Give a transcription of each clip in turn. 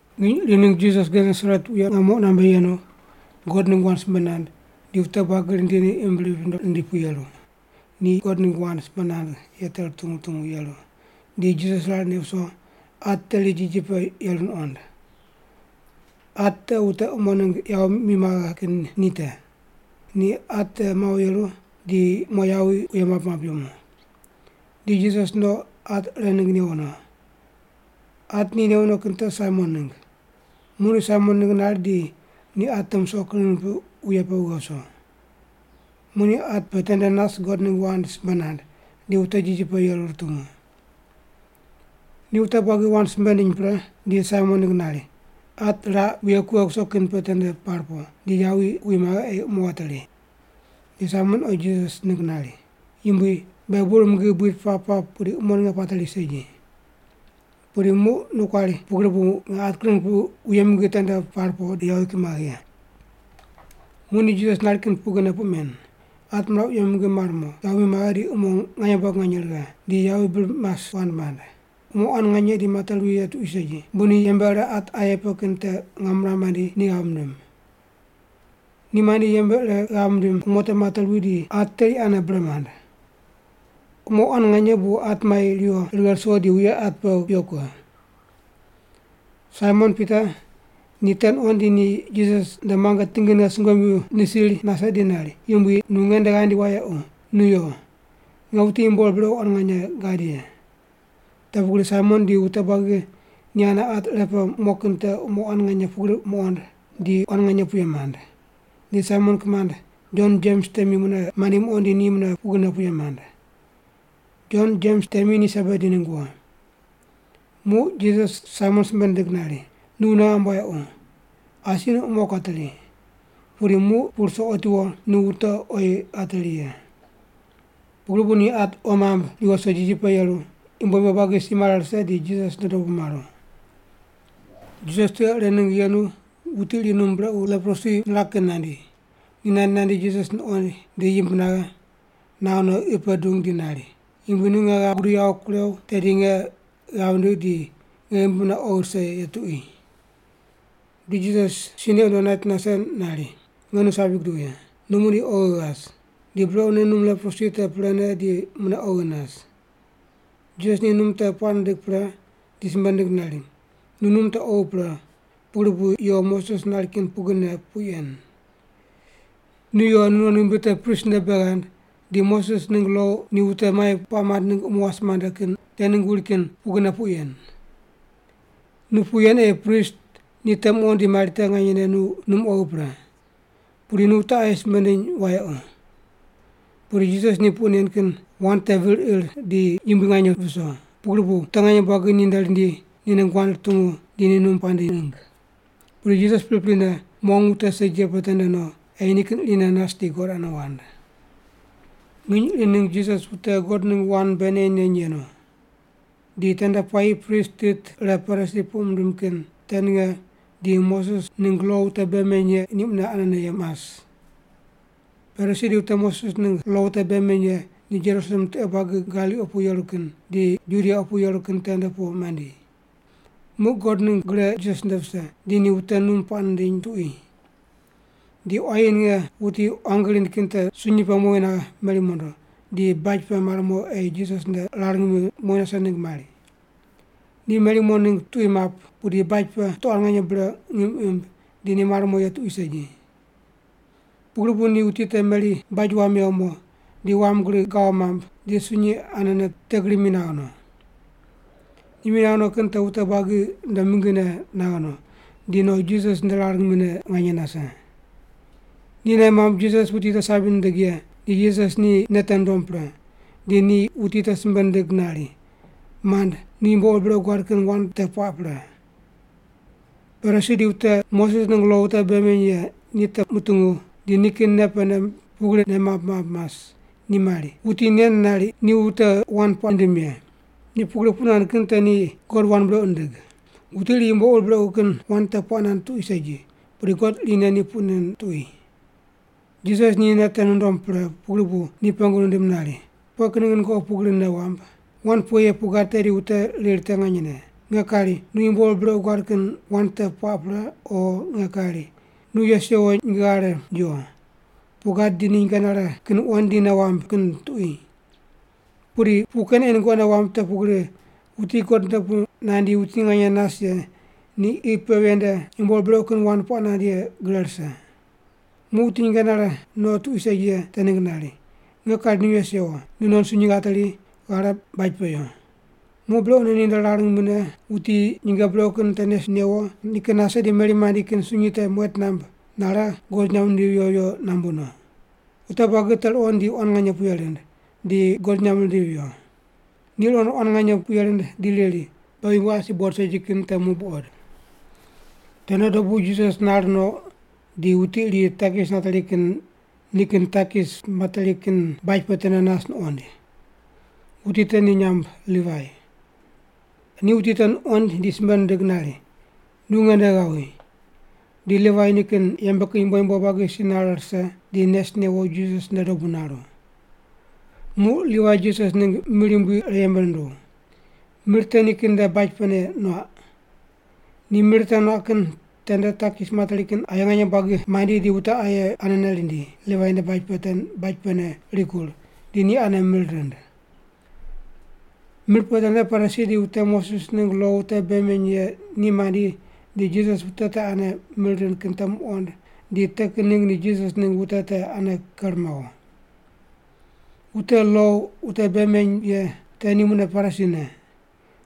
Nginy iri ningg Jisas Genesaret wuye ngamo qunambe yenu, God ningg wand simbe nand, di wute buagi rindi, ni imb rip rundo rindi pu yeru, ni God ningg wand simbe nand ye te rutungu rutungu yeru, di Jisas rar neq wuso at teri jiji pe te yeru nuqond. At te wute umo ningg yawi mi maghe kin ni te. Ni at te mawo yeru, di mo yawi wuye map map yemu. Di Jisas no, at ire ningg newo no. At ni newo kin te Saimon ningg. Muq ni Saimon ningg nari di ni at te musoq kring nipiq wuye pe wughe wuso. Muq ni at pe tende nas God ningg wand simbe nand, di wute jiji pe yeru rutungu. Ni wute buagi wand simbe nindiny pre, di Saimon ningg nari, “At raq wuye kughe kuso kin pe tende par po, di yawi wi maghe ei umo wateri.” Di Saimon oyi Jisas ningg nari, “Yumbui, beghi bur mingi buid pap pap pudi umo ninge pateri segi. Pudi muq nu kuari pu pugri bu nge at kring kipiq wuye mingi tende par po, di yawi ki maghe ye.” Muq ni Jisas nari kin pugrine puq men: At miraq wuye mingi mar mo, yawi mi maghe di umo nganye buagi nganye righe, di yawi bir mas wand mand. Umo quan nganye di mate ruwi ye tuqui segi, bu ni yembe ire at aye pe kin te ngam miram mandi ni ghav mindim. Ni mandi yembe ire ghav mindim umo te mate ruwi di at teri ane bre mand. Umo quan nganye bu at mai riwo righe ruso di wuye at pe kuyo kughe. Saimon Pita ni te nuqond di ni Jisas nde muange tingine sungomyu nisir nase di nari, “Yumbui, nu nge nde ghandi wayequ, nu yo. Nge wuti yumbo ur brequ quan nganye gad ye.” Te pugri Saimon di wute buagi ni ane at ire pe mo kin te umo quan nganye pugri muqond, di quan nganye puye mand. Di Saimon kimand, Jon Jems temi mune mandi muqond di ni mune pugrine puye mand. Jon Jems temi ni Sebedi ningg wo. Muq Jisas Saimon simbe nindig nari, “Nu wune ghamb wayequ. Asi nu umo kuateri, pudi muq pu ruso otiwo nu wute oyi ghateri ye.” Pugri bu ni at qo mamb riwo ruso jiji pe yeru, yumbo yumbo buagi si mare rise, di Jisas nde dobu maru. Jisas tiqe ire ningg yenu wuti iri num brequ leprosi niraq kin nandi. Ni nandi nandi Jisas nuqoind di yimb naghe, naghe no qi pe dung di nari, “Yumbui, nu nge ghav gudigh yawo kurew, tedi nge ghav ndigh di nge ghimbi mune oghi rise ye tuqui.” Di Jisas si neq wundo nait nase nari, “Nge nu sabi guduw ye. Nu muqdi oghi ghas!” Di brequne num leprosi te prene di mune oghi nas. Jisas ni num te puaq nindig pre, di simbe nindig nari, “Nu num te oghi pre pugri bu yo Moses nari kin pugrine puq yen. Nu yo nunon ghimbi te prist nde bei ghand, di Moses ningg lo ni wute mai puaq mand ningg umo wase mande kin te ningg wuri kin pugrine puq yen. Nu puq yen ei prist ni te muqond di mari te nganyene nu num oghi pre. Pudi nu wute aye simbe ndiny wayequ.” Pudi Jisas ni puq nen kin wand te vir ir di yumbui nganye viso, pugri bu wute nganye buagi ni nde rindi ni ningg wand rutungu di ni num puaq nindiny ningg. Pudi Jisas priprine, mong wute segi ye pe tende no, ei nikin irine nas di God ane wand. Nginy iri ningg Jisas wute God ningg wand bei neny neny yenu. Di tende puayi prist tit ire Parisi puq mindim kin te ninge di wute Moses ningg lo wute bei meny ye ni mune anene mas. Parisi di wute Moses ningg lo wute bei meny ye ni Jerusalem tiqe buagi Galili opu yeru kin, di Judia opu yeru kin tende pu mandi. Muq God ningg gre Jisas nde vise, di ni wute num puaq nindiny tuqui. Di quayi ninge wuti quangi rind kin te sunyi pe mowi naghe, meri mondo, di baj pe mar mo ei Jisas nde rar ngimi mowi nase ningg mari. Ni meri mar mo ningg tuqui map, pudi baj pe wute quan nganye bre ngim imb, di ni mar mo ye tuqui segi. Pugri bu ni wuti te meri baj wam mewo mo, di wam gri gawo mamb, di sunyi anene te gri mi naghe no. Ni mi naghe no kin te wute buagi nde mingine naghe no, di no Jisas nde rar ngimine nganye nase. Ni nei mamb Jisas wuti te sabi nindig ye di Jisas ni nei te nundom pre, di ni wuti te simbe nindig nari, “Mand, nu yumbo ur brequ guad kin wand te puaq pre.” Parisi di wute Moses ningg lo wute bei meny ye ni te mutungu di nikin nei pene pugri nei mamb mamb mas, ni mari, “Wuti nen nari ni wute wand puaq nindim ye. Ni pugri puq nand kin te ni God wand brequ nindig. Wuti iri yumbo ur brequ kin wand te puaq nand tuqui segi, pudi God irine ni puq nen tuqui.” Jisas ni nei te nundom pre pugri bu ni pengu nindim nari, “Pughe kin ningg nungoqi pugri nei wamb? Wand pughe ye puq gad tedi wute riri te nganyene: Nge kari, ‘Nu yumbo ur brequ guad kin wand te puaq pre,’ o nge kari, ‘Nu yes yewo nyinge ghare yo’ puq gad di ni nyinge nare kin wuqond di nei wamb kin tuqui? Pudi puq ken ei nungoqi nei wamb te pugri wuti God nde pu nandi wuti nganye nas ye ni qi pe ven nde yumbo ur brequ kin wand puaq nand ye gre rise.” Muq wuti nyinge nare tuqui segi ye te ningg nari, “Nge kari nu yes yewo, nunon sunyi ghateri, ghare baj pe yo.” Muq brequne ni nde rar ngimine wuti nyinge brequ kin te nes newo nikin nase di meri mandi kin sunyi te muet namb, nare God nyamb nindivi viyo viyo nambu no. Wute buagi te ruqond di quan nganye puye rind, di God nyamb rindivi viyo. Ni ruqond quan nganye puye rind di riri, “Beghi yumbo asi buqod segi kin te muq buqod.” Tende dobu Jisas nar no, di wuti iri takis nateri kin nikin takis nateri kin baj pe tende nas nuqoind. Wuti te ni nyamb Livai. Ni wuti te nuqoind di simbe nindig nari, “Nu nge nde ghawi.” Di Livai nikin yembe kin yumbo yumbo buagi si nare rise, di nes newo, Jisas nde dobu naru. Muq Livai Jisas ningg mir yumbui ire yembe nunduw. Mir te nikin nde baj pene nuaq. Ni mir te nuaq kin tende takis materi kin aye nganye buagi mandi di wute aye anene rindi, Livai nde baj pene rikur, di ni ane mir rind. Mir pe tende Parisi di wute Moses ningg lo wute bei meny ye ni mandi di Jisas wute te ane mir rind kin te muqond di te kin ningg ni Jisas ningg wute te ane ker mawo. (Wute lo wute bei meny ye te ni mune Parisi ne.)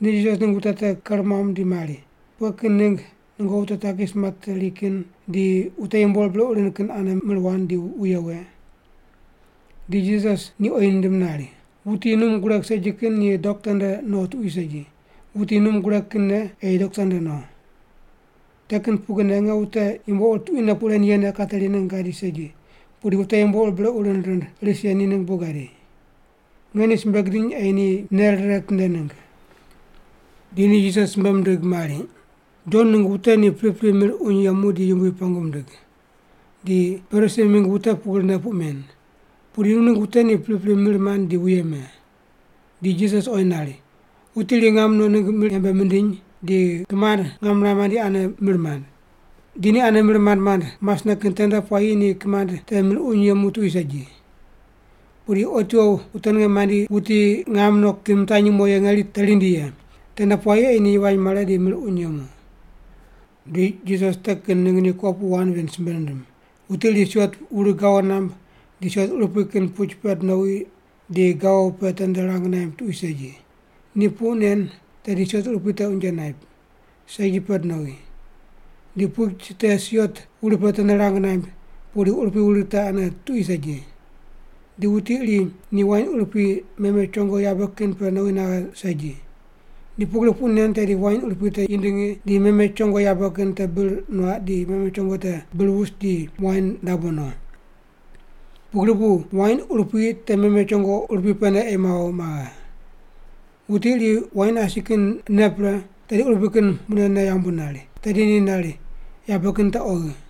Ni Jisas ningg wute te ker muam di mari, “Pughe kin ningg nungoqi wute takis materi kin di wute yumbo ur brequ rind kin ane mir wand di wuye we?” Di Jisas ni oyi nindim nari, “Wuti num gureg segi kin ni dokta nde no tuqui segi, wuti num gureg kinne ei dokta nde no. Te kin pugrine nge wute yumbo ur tuquine puq ren yene kateri ningg gadi segi, pudi wute yumbo ur brequ rind rind ris ye ni ningg bu gadi. Nge ni simbe gidiny ei ni nei rire ritinde ningg.” Di ni Jisas simbe mindig mari, “Jon ningg wute ni pripri mir uny yemu di Yumbui pengu mindig. Di Parisi mingg wute pugrine puq men. Pudi nu ningg wute ni pripri mir mand di wuye me.” Di Jisas nari, “Wuti iri ngam no ningg mir yembe mindiny di kimand ngam niram mandi ane mir mand. Di ni ane mir mand mand masne kin tende puayi ni kimand te mir uny yemu tuqui segi. Pudi otiwo wute ninge mandi wuti ngam no kin mitanyi mo ye ngeri te rindi ye. Tende puayi ei ni yivany mare di mir uny yemu.” Di Jisas te kin ningg ni kopuqu wand ven simbe nindim, “Wuti iri siot wuri gawo namb, di siot urupui kin puch pend nowi, di gawo pe tende rang naimb tuqui segi. Ni puq nen tedi siot urupui te unje naip, segi pend nowi. Di puch te siot wuri pe tende rang naimb, pudi urupui wuri te ane tuqui segi. Di wuti iri ni wain urupui meme chongo yabe kin pe nowi naghe segi. Ni pugri puq nen tedi wain urupui te yindingi di meme chongo yabe kin te bir nuaq di meme chongo te bir wus di wain dabo no. Pugri bu wain urupui te meme chongo urupui pene ei mawo maghe. Wuti iri wain asi kin ne pre, tedi urupui kin mune ne yambu nari. Tedi ni nari, ‘Yabe kin te oghi’.”